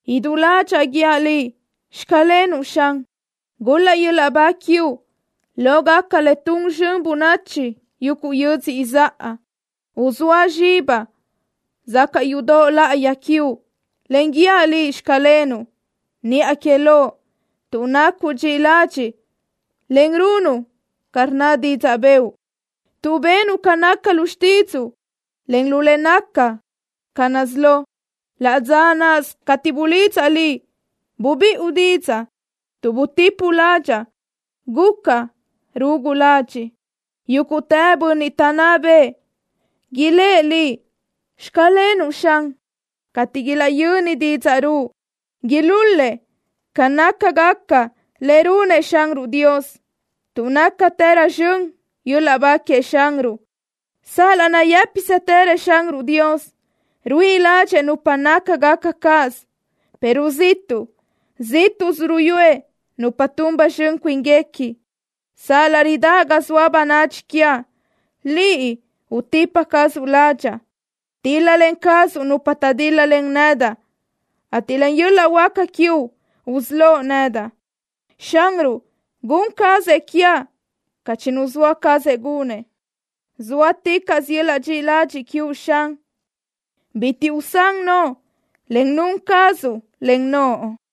Idú ládxaʼa guíaʼ Liʼ, “Xclenuʼ” Xan. Gul-laʼ yöl-laʼ ba quiuʼ lógaca le tun zxön bönachi yuguʼ yödzö izáʼa. Uzóa zxibaʼ sacaʼ yudoʼ láʼayi quiuʼ, en guíaʼ Liʼ, “Xclenuʼ” niʼa que Loʼ, tuʼ nacuʼ dxiʼi ladxiʼ, en runuʼ ca rnna didzaʼ bëʼu, tuʼ benuʼ ca naca lu xtídzuʼu, en lu le naca ca nazíʼi lo. Laʼ dza náʼasö cateʼ bulidzaʼ Liʼ, bubiʼu didzaʼ. Tuʼ butipuʼ ládxaʼa, gucaʼ rugu ladxiʼ. Yúguʼtë bönniʼ taʼnná bëʼë ilë́ʼ Liʼ: “Xclenuʼ” Xan, cateʼ ilaʼyönnëʼ didzaʼ ruʼu. Ilul-lëʼ ca nácagaca le runëʼ Xanruʼ Dios, tuʼ nácatërö zxön yöl-laʼ ba queëʼ Xanruʼ. Sal-laʼ nayë́pisëtërëʼ Xanruʼ Dios ruíʼi ládxëʼë nupa nácagaca cáʼasö, pero ziʼtuʼ zíʼtuʼsö ruyúëʼ nupa tun ba zxön cuínguequi. Sal-laʼ ridáʼ ga zoa bönadxi quiaʼ, Liʼ utipa cazuʼ ládxaʼa. Tíl-lalen cazuʼ nupa taʼdíl-lalen nedaʼ, ateʼ len yöl-laʼ huáca quiuʼ usölóʼ nedaʼ. Xanruʼ gun cazëʼ quiaʼ ca chinuzóa cazëʼ gunëʼ. Zóaticaʼsö yöl-laʼ dxiʼi ladxiʼ quiuʼ, Xan. Bitiʼ usán noʼo le nun cazuʼ len naʼ cuinuʼ.